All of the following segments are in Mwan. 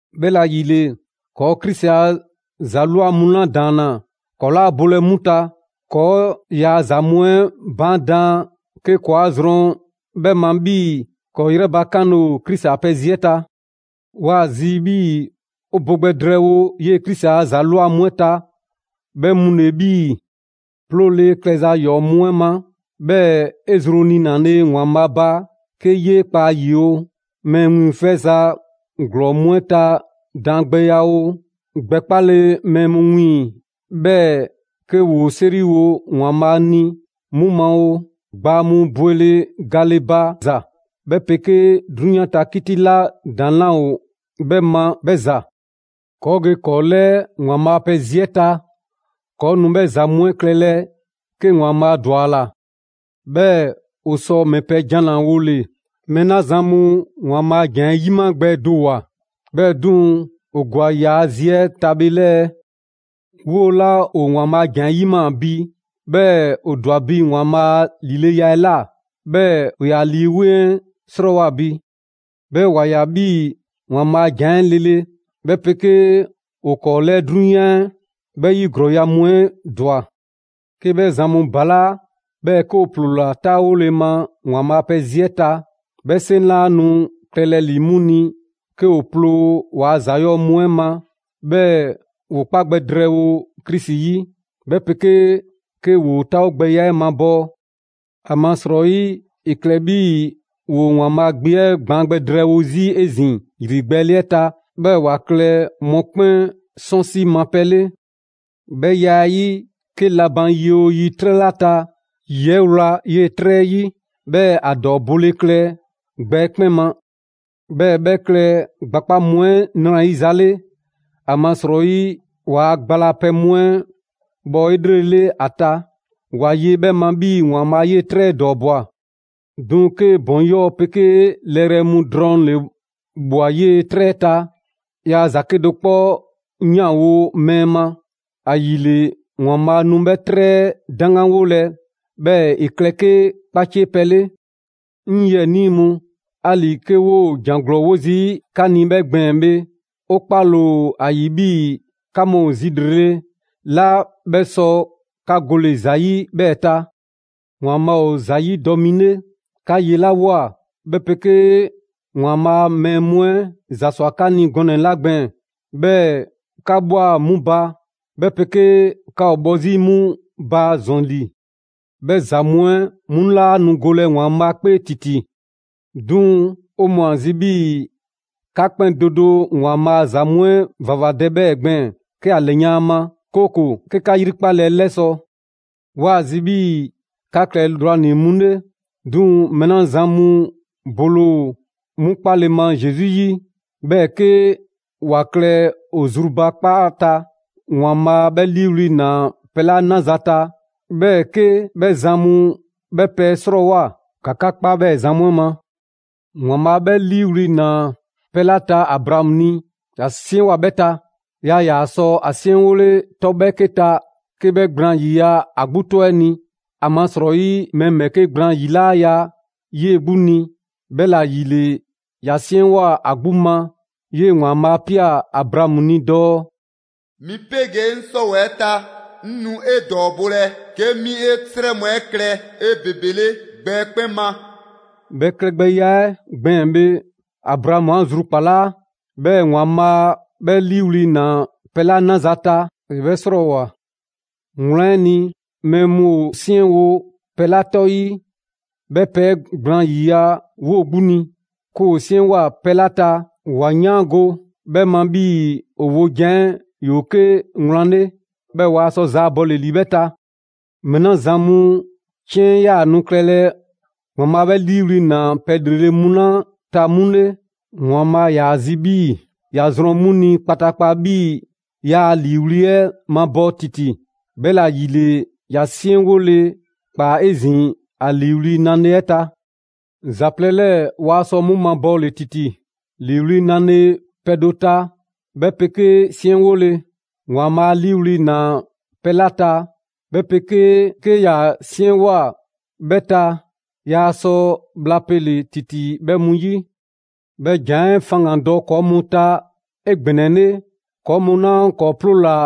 'Bhɛla‑ ‑yile, ‑kɔɔ' Krisi a ‑za ꞊lwa mu 'la ‑daanna, ‑kɔɔ' 'laa bolɛ 'mu ta, ‑kɔɔ' ‑yaa' ‑za mu 'ɛ baan' daan 'ke ‑kɔɔa' zrɔn 'bhɛ ma 'bhii‑ ‑kɔɔ' 'yrɛ bakanle ‑o Krisi a pɛ zi 'ɛ ta. 'Waa‑ zi 'bhii‑ 'o bo gbɛ drɛɛwo 'yee‑ Krisi a ‑za ꞊lwa mu 'ɛ ta, 'bhɛ mu ‑le 'bhii‑: 'ploole klɛza ‑yɔɔ' mu 'ɛ ma, 'bhɛɛ‑ 'e zru niinale ‑Waanbhaa' ba 'ke 'yee kpa ‑a ‑yi oo, mɛɛ wiiŋfɛza ‑glɔɔn mu 'ɛ ta daangbɛya oo, gbɛ 'kpale mɛɛ mu wiiŋ‑ 'bhɛɛ‑ 'ke ‑woo 'seriwo ‑Waanbhaa' ni 'mu ma oo, gbaa mu bwele gale ba za 'bhɛ 'pegee 'drunyan ta 'kiti 'la ‑daŋ' 'laa ‑o 'bhɛ ma 'bhɛ ‑za. ‑Kɔɔ' ge ‑kɔɔ' 'lɛɛ ‑Waanbhaa' a pɛ zi 'ɛ ta! ‑Kɔɔ' nu 'bhɛɛ‑ ‑za mu 'ɛ klɛlɛ 'ke ‑Waanbhaa' ‑dwa ‑a ‑la. 'Bhɛɛ‑ 'o sɔ ‑mɛ pɛ jan ‑la wole‑ mɛɛ 'la mɛɛ 'la zan mu ‑Waanbhaa' a ‑jan 'ɛ 'yima‑ gbɛ do ‑woa, 'bhɛɛ‑ 'duŋ‑ ‑o ‑gwa ‑yaa' zi 'ɛ ta bhe 'lɛɛ‑? 'Woo‑ 'la ‑o ‑Waanbhaa' a ‑jan 'ɛ 'yimaa‑ bi, 'bhɛɛ‑ ‑o ‑dwa bi ‑Waanbhaa' a ‑lileya 'ɛ ‑la, 'bhɛɛ‑ ‑o ‑yaa' Lii 'Weŋ 'ɛ 'srɔɔwoa‑ bi. 'Bhɛɛ‑ ‑wa ꞊ya 'bhii‑ ‑Waanbhaa' a ‑jan 'ɛ lele, 'bhɛ 'pegee ‑o ‑kɔɔ' 'lɛɛ 'drunyan 'ɛ 'bhɛ 'yi ‑glɔɔya' mu 'ɛ ‑dwa. 'Ke 'bhɛ zan mu ‑balaa' 'bhɛɛ‑ 'ke ‑o ‑ploola 'taawole ma ‑Waanbhaa' a pɛ zi 'ɛ ta, 'bhɛ 'seŋ 'laa nu klɛlɛ ‑li 'mu ni 'ke ‑o ploo ‑waa' ‑za 'yɔɔ‑ mu 'ɛ ma 'bhɛɛ‑ ‑woo 'kpa gbɛ drɛɛwo Krisi 'yi, 'bhɛ 'pegee 'ke ‑woo 'taawogbɛya 'ɛ mabɔɔ. ‑Amasrɔyi, ‑e klɛ 'bhii‑ ‑woo ‑Waanbhaa' Gbe 'ɛ gbaan gbɛ drɛɛwo 'zi 'ezin‑ ‑yrigbɛɛle 'ɛ ta, 'bhɛɛ‑ ‑wa klɛ mɔkpɛn' 'sɔnsi ma pɛ 'le. 'Bhɛ ya 'ɛ 'yi, 'ke la ban yi 'oo yi 'trɛ 'la ta, ‑yi 'ɛ wla 'yee‑ 'trɛ 'ɛ 'yi, 'bhɛɛ‑ ‑a ‑dɔɔ bole klɛ gbɛ 'ɛ 'kpɛn ma. 'Bhɛɛ‑ 'bhɛ klɛ gbakpa' mu 'ɛ ‑nrayiza 'le; ‑amasrɔyi ‑waa' gba la pɛ mu 'ɛ bhɔ 'elrele ‑a ta, ‑wa ye 'bhɛ ma 'bhii‑ ‑Waanbhaa' 'yee‑ 'trɛ 'ɛ ‑dɔɔbwa. 'Duŋ‑ 'ke ‑bɔn 'yɔɔ‑ 'pegee lɛrɛ mu drɔŋ ‑le ꞊bhwa 'yee 'trɛ 'ɛ ta, yaa ‑za 'kedo‑ 'kpɔ 'yanwo‑ mɛɛ ma. ‑Ayile ‑Waanbhaa' nu 'bhɛ 'trɛ 'ɛ 'daŋganwolɛ 'bhɛɛ‑ ‑e klɛ 'ke 'kpacie pɛ 'le. 'Ŋ 'yiɛnii mu, 'ali‑ 'ke 'woo‑ ‑jan ‑glɔɔ 'wo 'zi 'ka ni 'bhɛ gbɛɛn‑ bhe, 'o 'kpale‑ ‑o ‑a ‑yi 'bhii‑ 'ka mu ‑o zi ‑lrele' 'la 'bhɛ sɔ 'ka gole‑ ‑za 'yi 'bhɛɛ‑ ta. ‑Waanbhaa' ‑o ‑za 'yidɔ‑ mi 'le. 'Ka 'yelawoa, 'bhɛ 'pegee ‑Waanbhaa' a mɛɛ mu 'ɛ ‑za ‑swa 'ka ni gɔnɛ‑ 'la gbɛɛn‑, 'bhɛɛ‑ 'ka ꞊bhwa 'mu ba, 'bhɛ 'pegee 'ka ‑o bhɔ 'zi 'mu ba ‑zɔn ‑li; 'bhɛ ‑za mu 'ɛ 'mu 'laa nu golɛ ‑Waanbhaa' 'kpee ‑titi. 'Duŋ‑ 'o mɔɔ ‑o ‑a zi 'bhii‑ 'ka 'kpɛn do do ‑Waanbhaa ‑a ‑za mu 'ɛ ‑vavadɛ 'bhɛɛ‑ gbɛɛn‑, 'ke 'a ‑lɛyan' ‑a ma; 'kooko‑ 'ke 'ka 'yrikpale 'ɛ 'lɛsɔ‑. 'Waa ‑a zi 'bhii‑ 'ka klɛ lrwanii‑ mu 'le. 'Duŋ‑ mɛɛ 'la zan mu bole ‑o 'mu 'kpale‑ ma Zesu 'yi, 'bhɛɛ‑ 'ke ‑wa klɛ ‑o zrubakpaa ta, ‑Waanbhaa' 'bhɛ 'liiwli‑ ꞊naa pɛ 'la 'naza‑ ta, 'bhɛɛ‑ 'ke 'bhɛ zan mu 'bhɛ pɛ 'ɛ 'srɔɔwoa꞊, ‑ka 'ka 'kpa 'bhɛɛ‑ zan mu 'ɛ ma. ‑Waanbhaa' 'bhɛ 'liiwli‑ ‑naa pɛ 'la ta Abraamu ni, ‑ya 'siɛnwoa꞊ 'bhɛ ta. Yaa ‑yaa sɔ ‑a 'siɛnwole 'tɔ 'bhɛɛke ta 'ke 'bhɛ gblaan ‑yiya' ‑a 'gbu 'tɔ 'ɛ ni, ‑amasrɔyi mɛɛ ‑bhɛɛke' gblaan ‑yi 'laa ya 'yee‑ 'gbu ni. 'Bhɛla‑ ‑yile ‑ya 'siɛnwoa꞊ ‑a 'gbu ma. 'Yee‑ ‑Waanbhaa' 'a ꞊pia Abraamu ni dɔɔ: «'Mi 'pegee 'ŋ 'sɔwɛɛ‑ ta, 'ŋ nu 'e ‑dɔɔbolɛ 'ke 'mi 'e 'srɛ mu 'ɛ klɛ 'ebebele gbɛ 'ɛ 'kpɛn ma.» 'Bhɛ klɛgbɛya 'ɛ gbɛɛn‑ bhe, Abraamu 'a zrubakpalaa, 'bhɛɛ‑ ‑Waanbhaa' 'bhɛ 'liiwli‑ ‑naa ‑a ni pɛ 'la 'naza‑ ta, ‑e 'bhɛ 'srɔɔwoa‑. Wlan 'ɛ ni, mɛɛ mu ‑o 'siɛnwo‑ pɛ 'la 'tɔ 'yi, 'bhɛ pɛ 'ɛ gblaan ‑yiya' 'woo‑ 'gbu ni. 'Ke ‑woo 'siɛnwoa꞊ pɛ 'la ta, ‑wa 'yaango‑ 'bhɛɛ‑ ma 'bhii‑ ‑o wojan 'ɛ ‑yoo 'ke wlan 'le, 'bhɛɛ‑ waa sɔ zaabɔle ‑li 'bhɛ ta. Mɛɛ 'la zan mu 'ciɛn 'yaa‑ nu klɛlɛ ‑Waanbhaa' 'bhɛ 'liiwli‑ ꞊naa pɛ ‑lrele' mu 'la ta 'mu 'le, ‑Waanbhaa' ‑yaa zi 'bhii‑ ‑ya zrɔn 'mu ni kpataakpa 'bhii‑ yaa ‑a ‑liiwli' 'ɛ mabɔɔ ‑titi, 'bhɛla‑ ‑yile ‑ya 'siɛnwole ꞊kpaa 'ezin‑ ‑a ‑liiwli' nale 'ɛ ta. ‑Za plɛ 'lɛɛ‑ waa sɔ 'mu mabɔɔle ‑titi: ‑liiwli' nale pɛ do ta, 'bhɛ 'pegee 'siɛnwole. ‑Waanbhaa' 'a 'liiwli‑ ꞊naa pɛ 'la ta, 'bhɛ 'pegee 'ke ‑ya 'siɛnwoa꞊ 'bhɛ ta, yaa sɔ bhla pele‑ ‑titi 'bhɛ mu 'yi. 'Bhɛ ‑jan 'ɛ faŋgandɔ ‑kɔɔ' mu ta 'egbɛnɛle, ‑kɔɔ' mu 'la ‑kɔɔ' 'ploola‑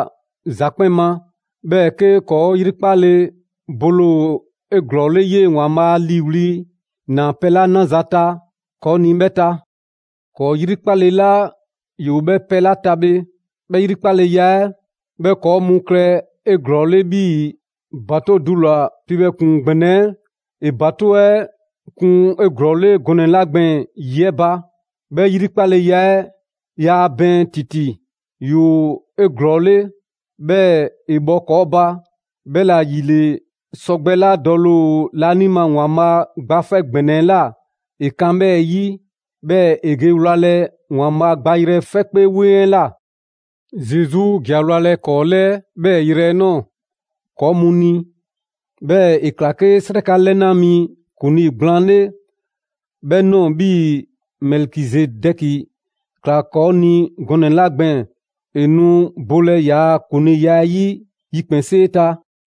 ‑za 'kpɛn ma, 'bhɛɛ‑ 'ke ‑kɔɔ' 'yrikpale bole ‑o 'eglɔɔle 'yee‑ ‑Waanbhaa' 'a 'liiwli‑ ꞊naa pɛ 'la 'naza‑ ta ‑kɔɔ' ni 'bhɛ ta. ‑Kɔɔ' 'yrikpale 'la ‑yoo 'bhɛ pɛ 'ɛ ta bhe, 'bhɛ ‑yrikpaleya 'ɛ 'bhɛ ‑kɔɔ' mu klɛ 'eglɔɔle 'bhii‑ ‑batoŋ' dula‑ piibhɛ ‑kpuŋ ‑gbɛnɛ 'ɛ ‑e ‑batoŋ' 'ɛ kun 'eglɔɔle gɔnɛ‑ 'la gbɛɛn‑ ‑yi 'ɛ ba. 'Bhɛ yrikpaleya 'ɛ yaa bɛɛn ‑titi, ‑yoo 'eglɔɔle, 'bhɛɛ‑ ‑e bhɔ ‑kɔɔ' ba. 'Bhɛla‑ ‑yile, sɔgbɛ 'la dɔle ‑o laanima ‑Waanbhaa' Gba 'Fɛ ‑Gbɛnɛ 'ɛ ꞊la, ‑e kan 'bhɛɛ‑ 'yi; 'bhɛɛ‑ ‑e ge wlalɛ ‑Waanbhaa' gbayrɛ 'fɛ 'kpee 'weŋ 'ɛ ꞊la. Zesu ‑ja wlalɛ ‑kɔɔ' 'lɛɛ 'bhɛɛ‑ yrɛ 'ɛ ꞊nɔɔ ‑kɔɔ' mu ni. 'Bhɛɛ‑ ‑e ꞊kla 'ke 'sraka 'lɛna mi ‑kuŋlii gblaan 'le 'bhɛ ꞊nɔɔ 'bhii‑ Mɛlikizedɛki ‑kla ‑kɔɔ' ni gɔnɛ‑ 'la gbɛɛn‑. ‑E nu bolɛ ‑yaa' ‑kuŋliiya 'ɛ 'yi yikpɛnsee ta.